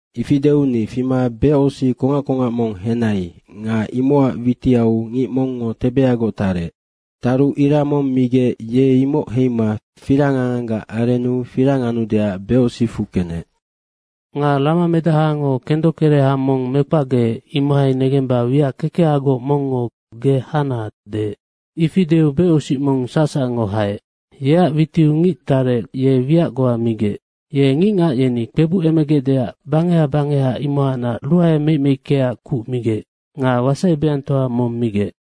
Ifi deu ni fima becosic kongac kongac mong henai nga imocac witiau ngic mongngo tebeagoc tarec. Taru ira mong migec ye imoc heima firang anganggac arennu firang anudeac becosicfu kenec. Nga ramamedahango kendokereha mong mekpacgeec, imohai negemba wiac kekehagoc mongngo “Ge hana!” deec. Ifi deu becosic mong sacsacngo haec. Yeac witiu ngic tarec, ye wiac goa migec. Ye ngicngac yeni kpebucemegecdeac bangeha bangeha, imohacnac ruae meic meickeac kuc migec nga wasai beangtoa mong migec.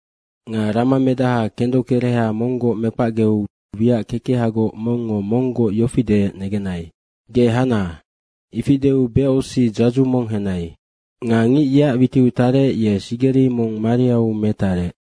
Nga Ramamedaha kendokereha monggoc mekpacgeu wiac kekehagoc mongngo monggoc yofi deec negenai, “Ge hana.” ifi deu becosic dzadzu mong henai. Nga ngic yeac witiu tarec, ye sigeri mong mariau metarec.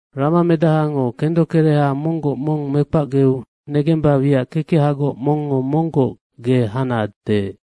Ramamedahango kendokereha monggoc mong mekpacgeu negemba wiac kekehagoc mongngo monggoc “Ge hana!” deec.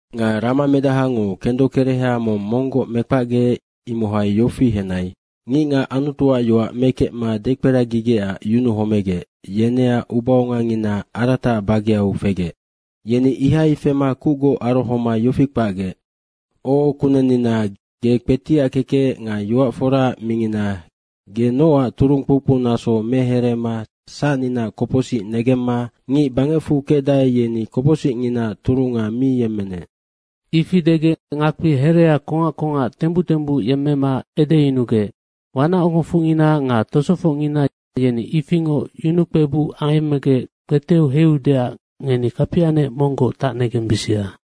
Nga ramamedahango kendokereha mong monggoc mekpacgeec, imohai yofi henai. Ngicngac Anutuac yoac mekecma dekperagigecac yunuhomegec, yeneac ubaongangina arataac bageau fegec. Yeni ihai fema kucgoc arohoma yofi kpacgec, “O Kunennina, ge kpetiackekec nga yoac foraac mingina, ge nocac turung kpoukpou naso mehereema sacninaac kopocsic negemma ngic bangecfu kecdae, yeni kopocsicnginaaac turunga mi yemmenec.” Ifi degec ngakpi herea kongac kongac tembuc tembuc yemmema edeyunugec, “Wanacogofocngina nga tosofocngina yeni ifingoc yunukpebuc ayemmegec kpeteu heiudeac ngeni kapianec monggoc tacnegembisia.”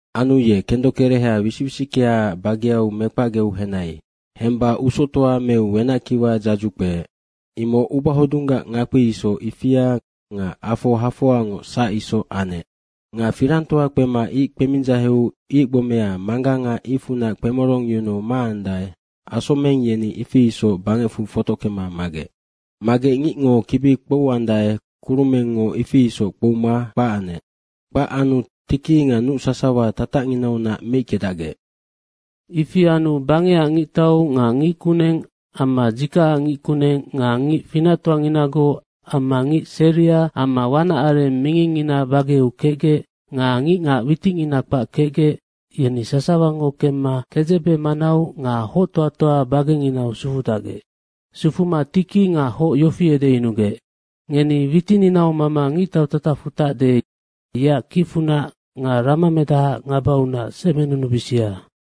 Anu ye kendokereha wisic wisickeaac bageau mekpacgeu henai. Hemba usoctoa meu wenackiwa dzadzu kpeec. Imoc ubahodunggac ngakpi isoc, ifia nga afo hafoangoc sac isoc anec. Nga firangtoa kpema ic kpemindzaheu ic gbomea mangganga icfunac kpemorongyunuu maandae, asomeng yeni ifi isoc bangecfu fotockema magec. Magec ngicngo kibi kpouandae, kurumengngo ifi isoc kpouma kpac anec. Kpac anu tiki nga nuc sasawa tatacnginaunac meickedacgec. Ifi anu bangecac ngictau nga ngickuneng amma dzikacac ngickuneng nga ngic finactoanginagoc amma ngic seria amma wanac areng mingingngina bageau kecgec nga ngicngac witicngina kpac kecgec, yeni sasawango kemma kedzebe manau nga hoctoatoa bagenginau sufudacgec. Sufuma tiki nga hoc yeni yofi edeyunugec, “Ngeni witininau mama ngictau tatacfu tacde, yeac kicfunac nga ramamedahaac ngabaunac semenunubisia.